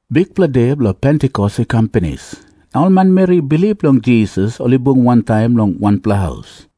Bikpela De Bilong Pentikos i kam pinis, na ol manmeri i bilip long Jisas ol i bung wantaim long wanpela haus.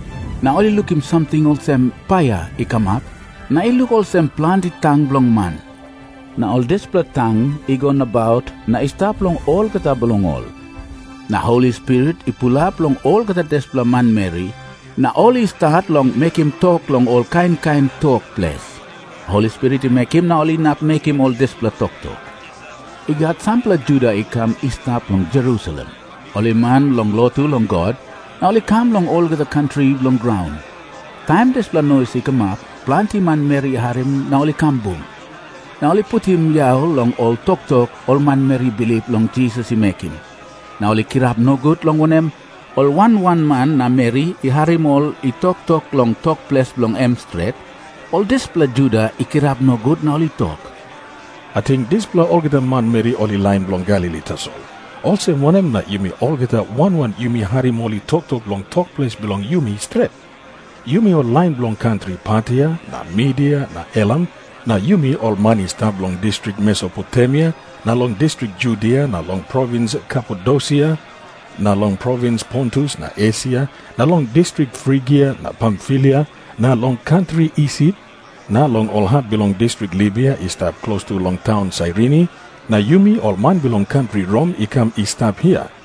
Na ol i lukim samting olsem paia i kamap, na i luk olsem planti tang bilong man. Na ol dispela tang i go nabaut na i stap long olgeta bilong ol. Na Holi Spirit i pulap long olgeta dispela manmeri, na ol i stat long mekim tok long ol kain kain tok ples. Holi Spirit i mekim na ol inap mekim ol dispela toktok. I gat sampela Juda i kam i stap long Jerusalem, ol i man bilong lotu long God, na ol i kam long olgeta kantri bilong graun. Taim dispela nois i kamap, planti manmeri i harim na ol i kam bung. Na ol i putim yau long ol toktok ol manmeri i bilip long Jisas i mekim, na ol i kirap nogut, long wanem, ol wan wan man na meri i harim ol i toktok long tok ples bilong em stret. Ol dispela Juda i kirap nogut na ol i tok, “Ating dispela olgeta manmeri ol i lain bilong Galili tasol. Olsem wanem na yumi olgeta wan wan yumi harim ol i toktok long tok ples bilong yumi stret. Yumi ol lain bilong kantri Partia na Midia na Elam, na yumi ol man i stap long distrik Mesopotemia na long distrik Judia na long provins Kapadosia na long provins Pontus na Esia na long distrik Frigia na Pamfilia na long kantri Isip na long ol hap bilong distrik Libia i stap klostu long taun Sairini, na yumi ol man bilong kantri Rom i kam i stap hia.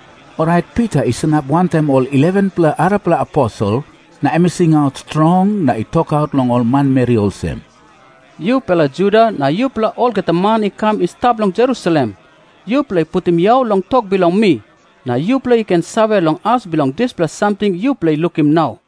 Orait Pita i sanap wantaim ol 11-pela arapela aposel na em i singaut strong na i tokaut long ol manmeri olsem, “Yupela Juda na yupela olgeta man i kam i stap long Jerusalem, yupela putim yau long tok bilong mi, na yupela i ken save long as bilong dispela samting yupela i lukim nau.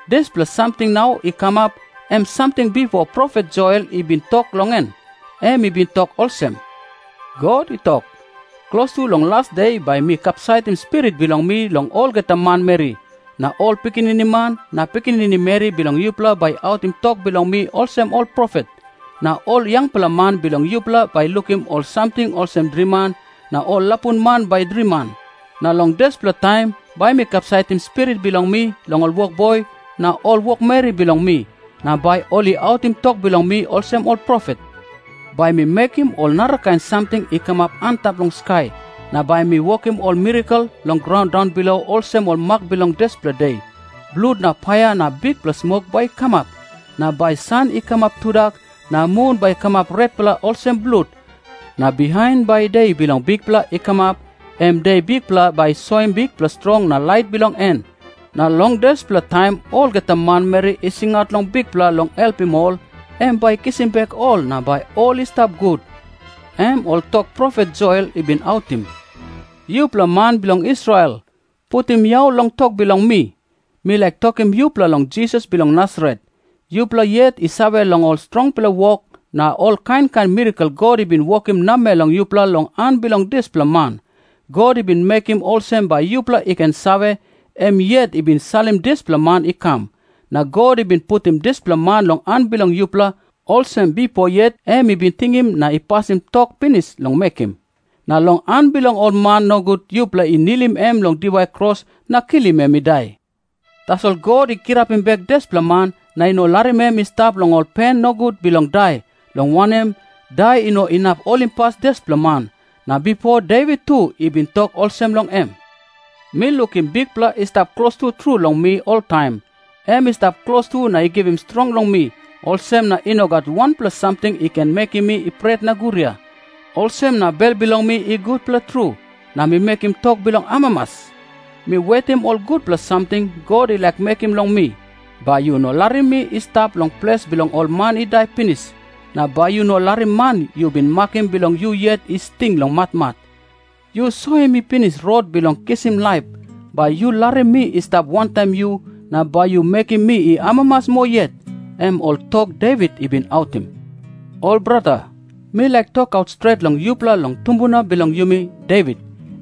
Dispela samting nau i kamap, em samting bipo profet Joel i bin tok long en. Em i bin tok olsem, ‘God i tok, “Klostu long las de bai mi kapsaitim Spirit bilong mi long olgeta manmeri. Na ol pikinini man na pikinini meri bilong yupela bai i autim tok bilong mi olsem ol profet. Na ol yangpela man bilong yupela bai i lukim ol samting olsem driman, na ol lapun man bai i driman. Na long dispela taim bai mi kapsaitim Spirit bilong mi long ol wokboi na ol wokmeri bilong mi, na bai ol i autim tok bilong mi olsem ol profet. Bai mi mekim ol narakain samting i kamap antap long skai, na bai mi wokim ol mirakel long graun daunbilo olsem ol mak bilong dispela De. Blut na paia na bikpela smok bai i kamap. Na bai san i kamap tudak, na mun bai i kamap retpela olsem blut. Na bihain bai De bilong Bikpela i kamap, em de Bikpela bai i soim bikpela strong na lait bilong en. Na long dispela taim olgeta manmeri i singaut long Bikpela long helpim ol, em bai i kisim bek ol na bai ol i stap gut.” ’ Em ol tok profet Joel i bin autim. “Yupela man bilong Israel, putim yau long tok bilong mi. Mi laik tokim yupela long Jisas bilong Nasaret. Yupela yet i save long ol strongpela wok na ol kain kain mirakel God i bin wokim namel long yupela long han bilong dispela man. God i bin mekim olsem bai yupela i ken save, em yet i bin salim dispela man i kam. Na God i bin putim dispela man long han bilong yupela, olsem bipo yet em i bin tingim na i pasim tok pinis long mekim. Na long han bilong ol man nogut yupela i nilim em long diwai kros na kilim em i dai. Tasol God i kirapim bek dispela man na i no larim em i stap long ol pen nogut bilong dai, long wanem, dai i no inap holimpas dispela man. Na bipo Devit tu i bin tok olsem long em, ‘Mi lukim Bikpela i stap klostu tru long mi oltaim. Em i stap klostu na i givim strong long mi, olsem na i no gat wanpela samting i ken mekim mi i pret na guria. Olsem na bel bilong mi i gutpela tru, na mi mekim tok bilong amamas. Mi wetim ol gutpela samting God i laik mekim long mi. Bai yu no larim mi i stap long ples bilong ol man i dai pinis. Na bai yu no larim man yu bin makim bilong yu yet i sting long matmat. Yu soim mi pinis rot bilong kisim laip. Bai yu larim mi i stap wantaim yu, na bai yu mekim mi i amamas moa yet.’ Em ol tok Devit i bin autim. “Ol brata, mi laik tokaut stret long yupela long tumbuna bilong yumi, Devit.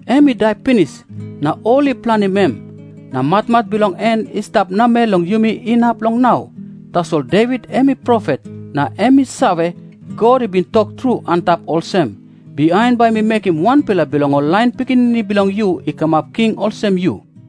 Em i dai pinis, na ol i planim em. Na matmat bilong en i stap namel long yumi inap long nau. Tasol Devit em i profet, na em i save, God i bin tok tru antap olsem, ‘Bihain bai mi mekim wanpela bilong ol lain pikinini bilong yu i kamap king olsem yu.’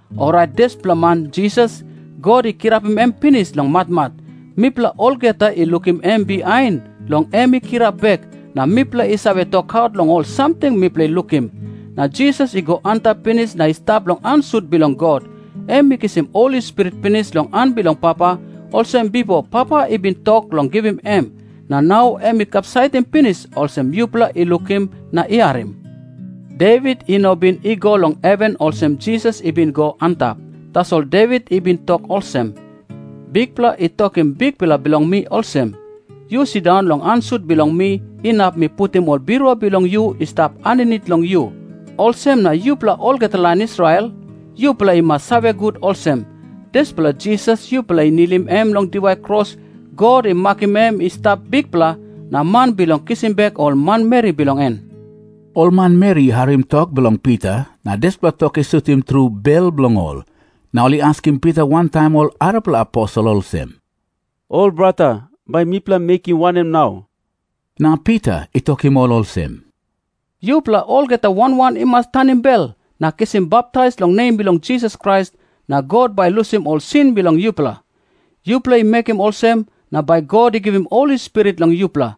Orait dispela man Jisas, God i kirapim em pinis long matmat. Mipela olgeta i lukim em bihain long em i kirap bek, na mipela i save tokaut long ol samting mipela i lukim. Na Jisas i go antap pinis na i stap long han sut bilong God. Em i kisim Holi Spirit pinis long han bilong Papa, olsem bipo Papa i bin tok long givim em. Na nau em i kapsaitim pinis, olsem yupela i lukim na i harim. Devit i no bin i go long heven olsem Jisas i bin go antap. Tasol Devit i bin tok olsem, ‘Bikpela i tokim Bikpela bilong mi olsem, “Yu sindaun long han sut bilong mi inap mi putim ol birua bilong yu i stap aninit long yu.” ’ “Olsem na yupela olgeta lain Israel, yupela i mas save gut olsem, dispela Jisas yupela i nilim em long diwai kros, God i makim em i stap Bikpela, na man bilong kisim bek ol manmeri bilong en.” Ol manmeri i harim tok bilong Pita, na dispela tok i sutim tru bel bilong ol. Na ol i askim Pita wantaim ol arapela aposel olsem, “Ol brata, bai mipela i mekim wanem nau?” Na Pita i tokim ol olsem, “Yupela olgeta wan wan i mas tanim bel na kisim baptais long nem bilong Jisas Krais, na God bai i lusim ol sin bilong yupela. Yupela i mekim olsem, na bai God i givim Holi Spirit long yupela.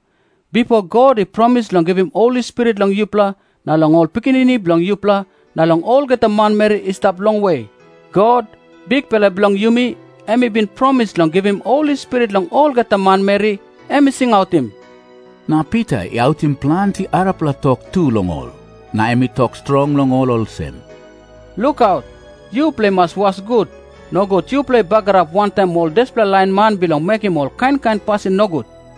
Bipo God i promis long givim Holi Spirit long yupela, na long ol pikinini bilong yupela, na long olgeta manmeri i stap longwe. God, Bikpela bilong yumi, em i bin promis long givim Holi Spirit long olgeta manmeri em i singautim.” Na Pita i autim planti arapela tok tu long ol, na em i tok strong long ol olsem, “Lukaut. Yupela i mas was gut, nogut yupela i bagarap wantaim ol dispela lain man bilong mekim ol kain kain pasin nogut.”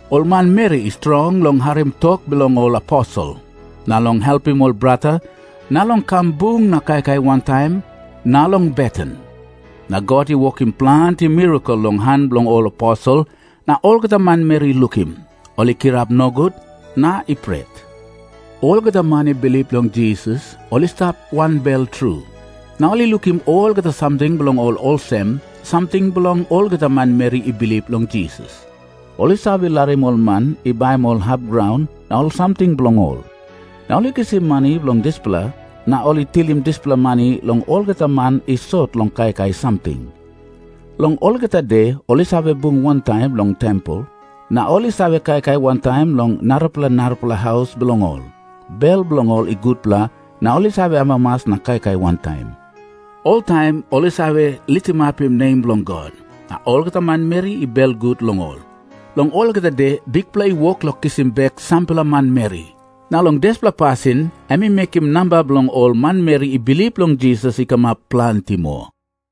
Ol manmeri i strong long harim tok bilong ol aposel, na long helpim ol brata, na long kam bung na kaikai wantaim, na long beten. Na God i wokim planti mirakel long han bilong ol aposel, na olgeta manmeri i lukim, ol i kirap nogut na i pret. Olgeta man i bilip long Jisas, ol i stap wanbel tru. Na ol i lukim olgeta samting bilong ol olsem samting bilong olgeta manmeri i bilip long Jisas. Ol i save larim ol man i baim ol hap graun na ol samting bilong ol, na ol i kisim mani long dispela, na ol i tilim dispela mani long olgeta man i sot long kaikai samting. Long olgeta de ol i save bung wantaim long tempel. Na ol i save kaikai wantaim long narapela narapela haus bilong ol. Bel bilong ol i gutpela, na ol i save amamas na kaikai wantaim. Oltaim ol i save litimapim nem bilong God, na olgeta manmeri i belgut long ol. Long olgeta de Bikpela i wok long kisim bek sampela manmeri, na long dispela pasin em i mekim namba bilong ol manmeri i bilip long Jisas i kamap planti moa.